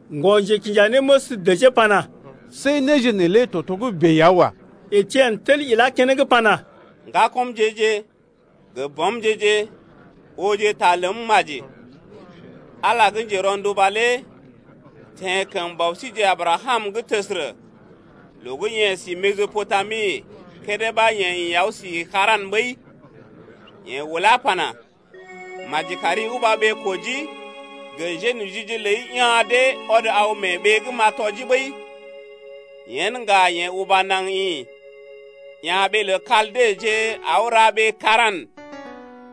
Ŋgɔ-njekinjanéməs dəjee pana: See néje neelé togə́bè ya wa. Etien tel ilá keneŋ pana: Ŋgakɔmje-je gə bɔmje-je, ooje ta ləm maji. Ala gə́ njero̰duba lé teḛ kəm bɔ síjeḛ Abrakam’g təsərə, loo gə́ yeḛ si Mesɔpotami kédé ɓa yeḛ aw si Sara̰ ɓəi, yeḛ ulá pana: Uba naŋg ḭ mee ɓee-kojii’g gə mbuna njénojije’g ləi ya̰ dee ɔd aw mee ɓee’d gə́ m’a gə tɔjii lé. Yen ŋga yeḛ uba naŋg ḭ, ya̰ ɓee lə Kaldeje, aw ra ɓee Sara̰.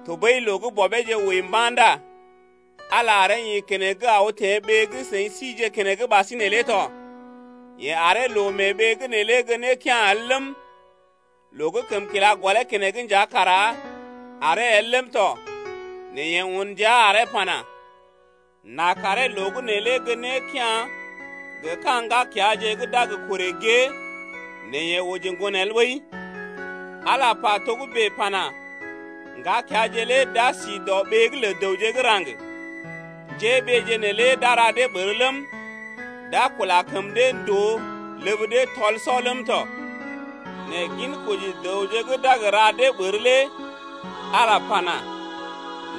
Tɔɓəi loo gə́ bɔbeeje wəi mba̰ ndá Ala aree ḭ keneŋ aw teḛ ɓee gə́ seḭ sije keneŋ ɓasinè lé tɔ. Yeḛ aree loo mee ɓee’g neelé gə́ nékea̰ el ləm, loo gə́ kəm kila gɔlee keneŋ nja kara aree el ləm tɔ. Nɛ yeḛ un ndia aree pana: N’a karee loo gə́ neelé gə́ nékea̰ gə ka̰ ŋgakeaje gə́ d’a gə korè gée nɛ yeḛ oji ŋgon el ɓəi. Ala lé pa togə́bè pana: Ŋgakeaje lé d’a si dɔɓee’g lə dəwje gə́ raŋg. Njéɓeeje neelé d’a ra dee ɓər ləm, d’a kula kəm dee ndòo ləb dee tɔl-sɔ ləm tɔ. Nɛ ginkoji dəwje gə́ d’a gə ra dee ɓər lé Ala pana: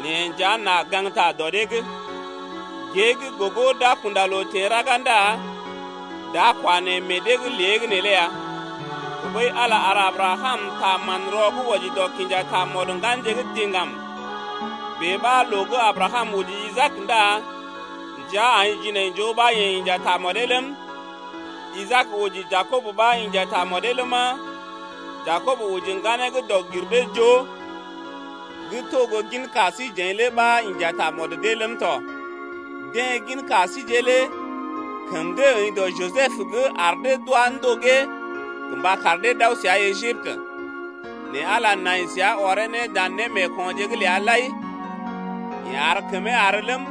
Neḛ nja n’a gaŋgta dɔ dee’g. Gée gə́ gogo d’a kunda loo teḛ raga ndá d’a kwa neḛ meḛ dee’g lée gə́ neelé ya. Tɔɓəi Ala ar Abrakam ta manrɔ gə́ wɔji dɔ kinja tamɔd ŋganje gə́ diŋgam. Bèe ɓa loo gə́ Abrakam oji Isaak ndá ndəa aḭ jinaijoo ɓa yeḛ inja tamɔdee ləm, Isaak oji Jakob ɓa inja tamɔdee ləma, Jakob oji ŋganee dɔg-gir-dee-joo gə́ to gə́ gin ka síjeḛ lé ɓa inja tamɔd dee ləm tɔ. Deḛ gin ka síje lé kəm dee əḭ dɔ Jisəb’g ar dee d’wá ndogee gə mba kar dee d’aw səa Ejiptə 0Nɛ Ala nai səa ɔree ne dan némeekonje’g ləa lai. Yeḛ ar kəmee àr ləm,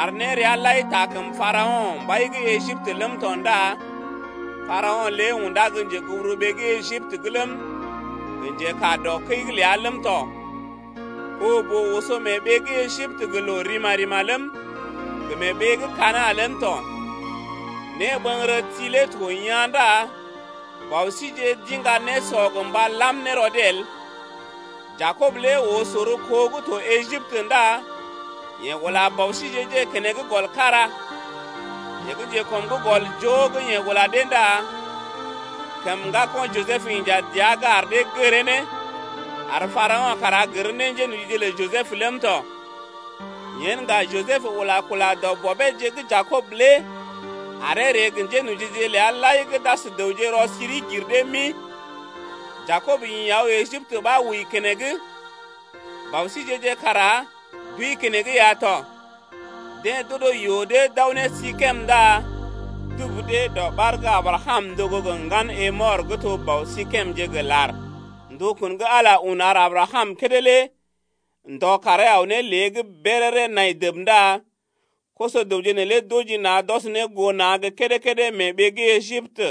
ar néreaje lai taa kəm Parao̰, mbai gə́ Ejiptə’g ləm tɔ ndá Parao̰ lé undá gə́ njeguburuɓee gə́ Ejiptə’g ləm, gə njekaa dɔ kəi’g ləa ləm tɔ. Ɓoo-boo oso mee ɓee gə́ Ejiptə gə loo rima-rima ləm, gə mee ɓee gə́ Kana̰ ləm tɔ. Néɓəŋgərəti lé to yaa̰ ndá bɔ síjeḛ d’iŋga nésɔ gə mba làm ne rɔ dee el. Jakob lé oo sor kó gə́ to Ejiptə ndá yeḛ ula bɔ síjeḛ-je keneŋ gɔl kára. Yeḛ gə́ njekɔm’g gɔl joo gə́ yeḛ ula dee ndá kəm ŋgako̰ Jisəb inja dəa’g ar dee gəree ne, ar Parao̰ kara gər ne njénojije lə Jisəb ləm tɔ. Yen ŋga Jisəb ula kula dɔ bɔbeeje gə́ Jakob lé aree ree gə njénojije ləa lai gə́ d’as dəwje rɔ-siri-gir-dee-mi. Jakob ḭ aw Ejiptə ɓa wəi keneŋ, bɔ síjeḛ-je kara d’wəi keneŋ ya tɔ. Deḛ d’odo yoo dee d’aw ne Sikem ndá dubu dee dɔɓar gə́ Abrakam ndogo gə ŋgan Hemɔr gə́ to bɔ Sikemje gə lar. Ndukun gə́ Ala un ar Abrakam kédé lé ndɔ karee aw ne lée’g béréré nai dəb ndá koso-dəwje neelé d’oji na̰ d’ɔs ne goo na̰ gə́ kédé-kédé mee ɓee gə́ Ejiptə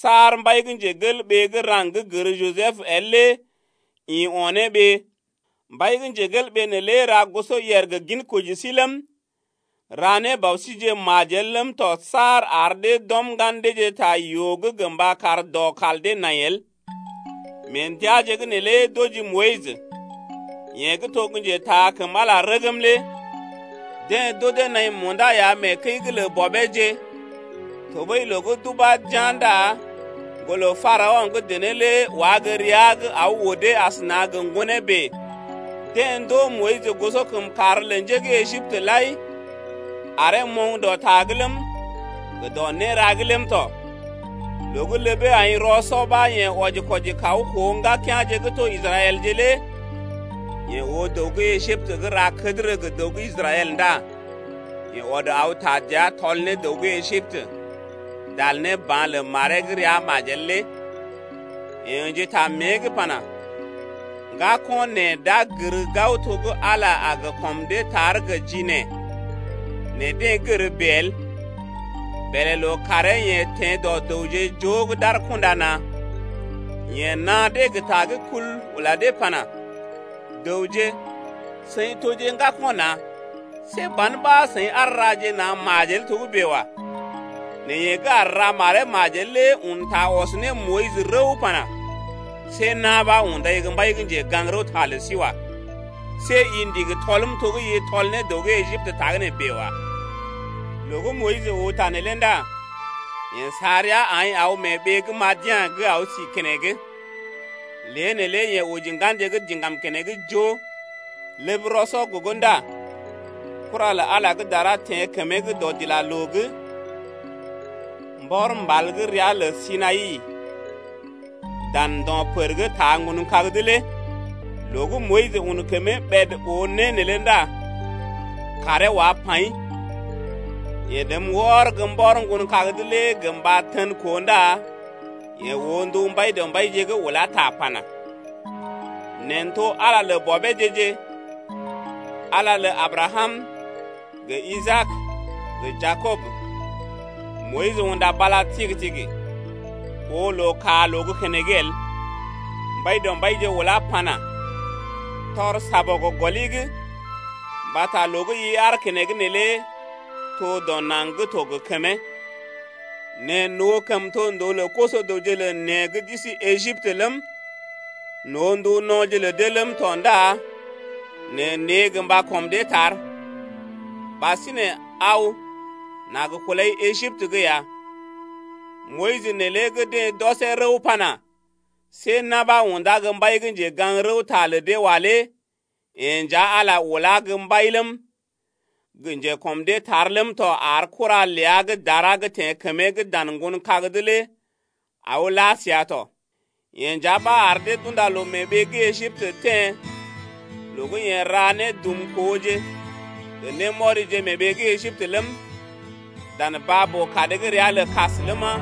saar mbai gə́ raŋg gə́ gər Jisəb el lé ḭ o̰ ne ɓee. Mbai neelé ra gosɔyèr gə ginkoji sí ləm, ra ne bɔ síjeḛ majel ləm tɔ saar ar dee d’ɔm ŋgan deeje ta yoo’g gə mba kar dɔ kal dee nai el. Mee ndəaje’g neelé d’oji Moyis, yeḛ gə́ to gə́ njetaa kəm Ala rəgm lé. Deḛ d’odee naḭ munda ya mee kəi’g lə bɔbeeje 1tɔɓəi loo gə́ d’ubá d’yá̰ ndá ŋgolə Parao̰ gə́ dené lé wá gə́ rəa’g aw odee asəna gə ŋgonee bèe. Deḛ ndoo Moyis gosɔkəmkàr lə njé gə́ Ejiptə lai, aree moŋg dɔ ta’g ləm, gə dɔ néra’g ləm tɔ. Loo gə́ ləbee aḭ rɔ-sɔ ɓa yeḛ wɔji-kwɔji kaw koo ŋgakea̰je gə́ to Israɛlje lé. Yeḛ oo dəw gə́ Ejiptə gə́ ra kədərə gə dəw gə́ Israɛl ndá yeḛ ɔd aw taa dəa tɔl ne dəw gə́ Ejiptə, dal ne ba̰ lə maree gə́ rəa majel lé. Yeḛ ə̰ji ta mée’g pana: Ŋgako̰ neḛ d’a gər gao to gə́ Ala a gə kɔm dee tar gə ji neḛ, nɛ deḛ gər bèe el. Bèlè lookàree yeḛ teḛ dɔ dəwje joo gə́ d’aar kunda na̰. Yeḛ naa dee gə ta gə́ kul, ula dee pana: Dəwje, seḭ toje ŋgako̰ na̰je, see ban ɓa seḭ aar raje na̰ majel togə́bè wa. Nɛ yeḛ gə́ aar ra maree majel lé un ta ɔs ne Moyis rəw pana: See na̰ ɓa undai gə́ mbai gə́ njegaŋ-rəwta lə sí wa. See i ndigi tɔlm to gə́ i tɔl ne dəw gə́ Ejiptə tagə́nè bèe wa. Loo gə́ Moyis oo ta neelé ndá yeḛ sa rəa aḭ aw mee ɓee gə́ Madian’g aw si keneŋ. Lée neelé yeḛ oji ŋganje gə́ diŋgam keneŋ joo. Ləb rɔ-sɔ gogo ndá kura gə́ dara teḛ kəmee’g dɔdilaloo’g mbɔr mbal gə́ ria lə Sinai dan ndo̰ pər gə́ taa ŋgon kag’d lé. Loo gə́ Moyis un kəmee ɓèd oo né neelé ndá karee wá paḭ. Yeḛ rəm wɔr gə́ mbɔr ŋgon kag’d lé gə mba tən koo ndá yeḛ oo ndu Mbaidɔmbaije gə́ ulá ta pana: Neḛ n’to Ala lə bɔbeeje-je, Ala lə Abrakam gə Isaak, gə Jakob. Moyis unda bala tigi-tigi, oo loo kaa loo gə́ keneŋ el. Mbaidɔmbaije ulá pana: Tɔr Négɔl gɔli’g mbata loo gə́ i aar keneŋ neelé to dɔ naŋg gə́ to gə kəmee. Neḛ n’oo kəmtondoo lə koso-dəwje lə neḛ gə́ d’isi Ejiptə ləm, n’oo ndu no̰je lə dee ləm tɔ ndá neḛ n’ree gə mba kɔm dee tar. Ɓasinè aw n’a gə kulai Ejiptə’g ya. Moyis neelé gə́ deḛ d’ɔsee rəw pana: See na̰ ɓa undá gə́ mbai gə́ njegaŋ-rəwta’g lə dee wa lé yeḛ nja Ala lé ulá gə́ mbai ləm, gə njekɔm dee tar ləm tɔ ar kura ləa gə́ dara gə́ teḛ kəmee’g dan ŋgon kag’d lé aw la səa tɔ. Yeḛ nja ɓa ar dee d’unda loo mee ɓee gə́ Ejiptə teḛ loo gə́ yeḛ ra nédumkooje gə némɔrije mee ɓee gə́ Ejiptə ləm, dan baa-boo-kad gə́ ria lə Baa-Kas ləma,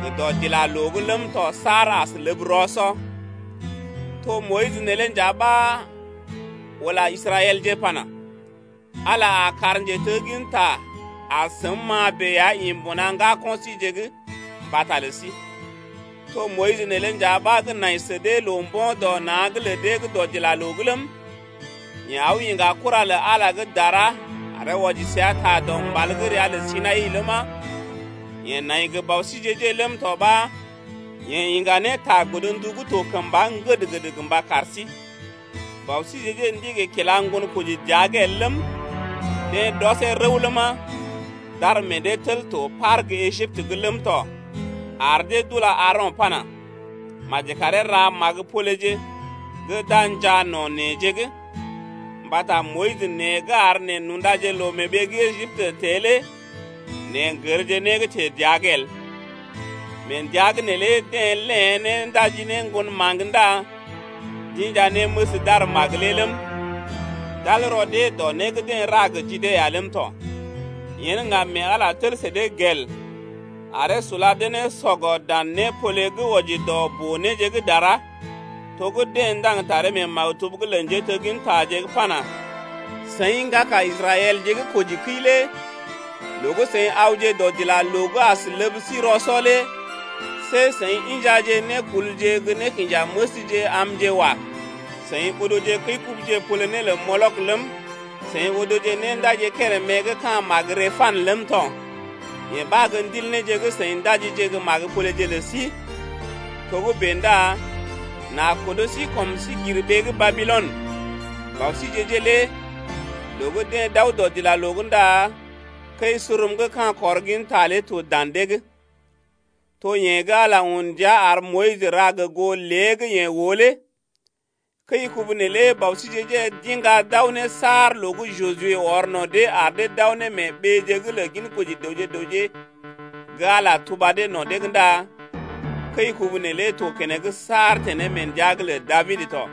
gə dɔdilaloo’g ləm tɔ saar as ləb rɔ-sɔ. To Moyis neelé nja ɓa ula Israɛlje pana: Ala a kar njetegginta gə́ as səm-ma bèe ya ḭ mbuna ŋgako̰ síje’g mbata lə sí. To Moyis neelé nja ɓa gə́ nai sə dee loo-mbo̰-dɔ-na̰’g lə deḛ gə́ dɔdilaloo’g ləm, yeḛ aw iŋga kura lə Ala gə́ dara aree wɔji səa ta dɔ mbal gə́ ria lə Sinai ləma, yeḛ nai gə bɔ síjeḛ-je ləm tɔ ɓa yeḛ iŋga ne ta godndu gə́ to kəmba ŋgəd-ŋgəd gə mba kar sí lé. Bɔ síje-je ndigi kila ŋgonkoji dəa’g el ləm, deḛ d’ɔsee rəw ləma, d’ar meḛ dee tel to par gə́ Ejiptə’g ləm tɔ ar dee d’ula Aaro̰ pana: Maji karee ra magə-poleje gə́ d’a njaa no̰ neḛje’g, mbata Moyis nee gə́ ar neḛ n’undaje loo mee ɓee gə́ Ejiptə teḛ lé neḛ n’gərje né gə́ teḛ dəa’g el. Mee ndəa’g neelé deḛ léḛ né ndaji ne ŋgon maŋg ndá d’inja néməs d’ar magə lé ləm, d’al rɔ dee wɔji dɔ né gə́ deḛ ra gə ji dee lé ya ləm tɔ. Yen ŋga mee Ala tel sə dee gel aree sula dee ne sɔgɔ dan népole gə́ wɔji dɔ boo-néje gə́ dara, to gə́ deḛ ndaŋg ne taree mee maktub’g lə njéteggintaje’g pana: Seḭ ŋgaka Israɛlje gə́ kojikəi lé Loo gə́ seḭ awje dɔdilaloo’g as ləb sí rɔ-sɔ lé See seḭ injaje nékulje gə́ nékinjanéməsje amje wa. Seḭ odoje kəi-kubuje pole né lə Molok ləm, Seḭ odoje néndaji kérèmé gə́ ka̰ magə Rempan ləm tɔ. Yee ɓa gə́ ndil néje gə́ seḭ ndajije gə́ magə-poleje lə sí ya. Togə́bè ndá n’a kodo sí kɔm sí gir ɓee gə́ Babilɔn. Bɔ síje-je lé loo gə́ deḛ d’aw dɔdilaloo’g ndá kəi-surum gə́ ka̰ kɔr ginta lé to dan dee’g. To yeḛ gə́ Ala lé un ndia ar Moyis ra gə goo lé gə́ yeḛ oo lé. Kəi-kubu neelé bɔ síjeḛ-je d’iŋga d’aw ne saar loo gə́ Juje ɔr no̰ dee ar dee d’aw ne mee ɓeeje’g lə ginkoji dəwje gə raŋg gə́ Ala tuba dee no̰ dee’g ndá kəi-kubu neelé to keneŋ saar teḛ ne mee ndəa’g lə Dabid tɔ.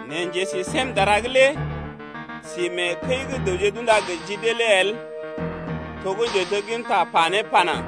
Nɛ Njesisémdara’g lé si mee kəi gə́ dəwje d’unda gə ji dee lé el to gə́ njetegginta pa ne pana: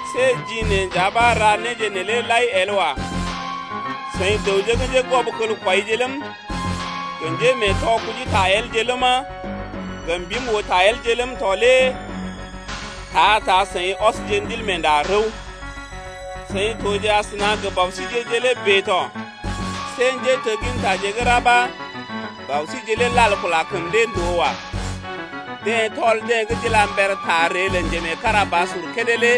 See ji neḛ nja ɓa ra néje neelé lai el wa. Seḭ dəwje gə́ njégwɔbkelkwɔije ləm, gə njémeetɔ kujita elje ləma, gə mbim-oo-ta-elje ləm tɔ lé ta-ta seḭ ɔsje Ndilmeenda rəw. Seḭ toje asəna gə bɔ síje lé bèe tɔ. See njéteggintaje gə́ ra ɓa bɔ síje lé lal kula kəm dee ndòo wa. Deḛ tɔl deḛ gə́ d’ila mber ta ree lə Njemeekarabasur kédé lé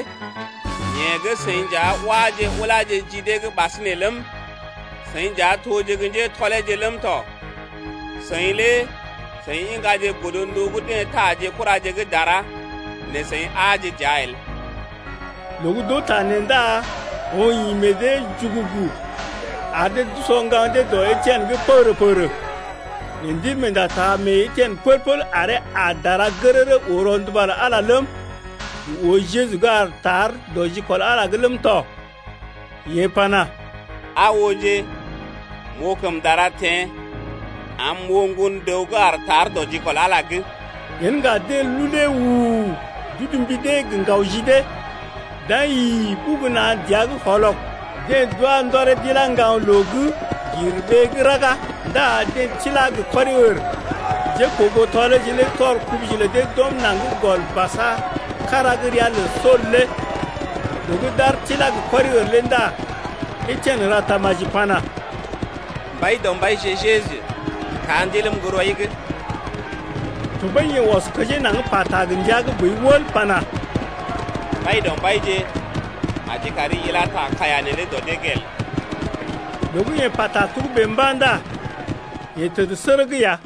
yeḛ gə́ seḭ nja wáje uláje ji dee’g ɓasinè ləm, seḭ nja toje gə́ njétɔleeje ləm tɔ. Seḭ lé seḭ iŋgaje godndu gə́ deḛ taa ji kuraje gə́ dara, nɛ seḭ aaje dəa el! Loo gə́ d’oo ta nee ndá oŋg ḭ meḛ dee’g jugugu, ar dee d’usɔ ŋgaŋ dee dɔ Etien’g pəgərə-pəgərə. Nɛ Ndilmeenda taa mee Etien pəl-pəl aree aa dara gərərə oo rɔnduba lə Ala ləm, gə oo Jeju gə́ aar tar dɔ jikɔl Ala’g ləm tɔ. Yeḛ pana: Aa ooje, m’oo kəm dara teḛ, am m’oo Ŋgon-dəw gə́ aar tar dɔ jikɔl Ala’g lé. Yen ŋga deḛ lulee u-u-u, d’udu mbi dee gə ŋgaw ji dee, d’aḭ yi-i-i ɓugu na̰ dəa’g wɔlɔg. Deḛ d’wá ndɔree d’ilá ŋgaŋ loo gir ɓee gə́ raga ndá deḛ tilá gə kɔri-ər. Njékoogoo tɔleeje lé tɔr kubuje lə dee d’ɔm naŋg gɔl basa kára gə́ ria lə Sool lé. Loo gə́ d’ar tilá gə kɔri-ər lé ndá Etien ra tamaji pana: Mbaidɔmbaije, Jeju taa ndiləm gə́ rɔi’g. Tɔɓəi yeḛ ɔs kəjee naŋg pata gə ndia gə́ boi wəl pana: Mbaidɔmbaije, maji kari ila ta kaiya neelé dɔ dee’g el. Loo gə́ yeḛ pata togə́bè mba̰ ndá yeḛ təd sərəg ya.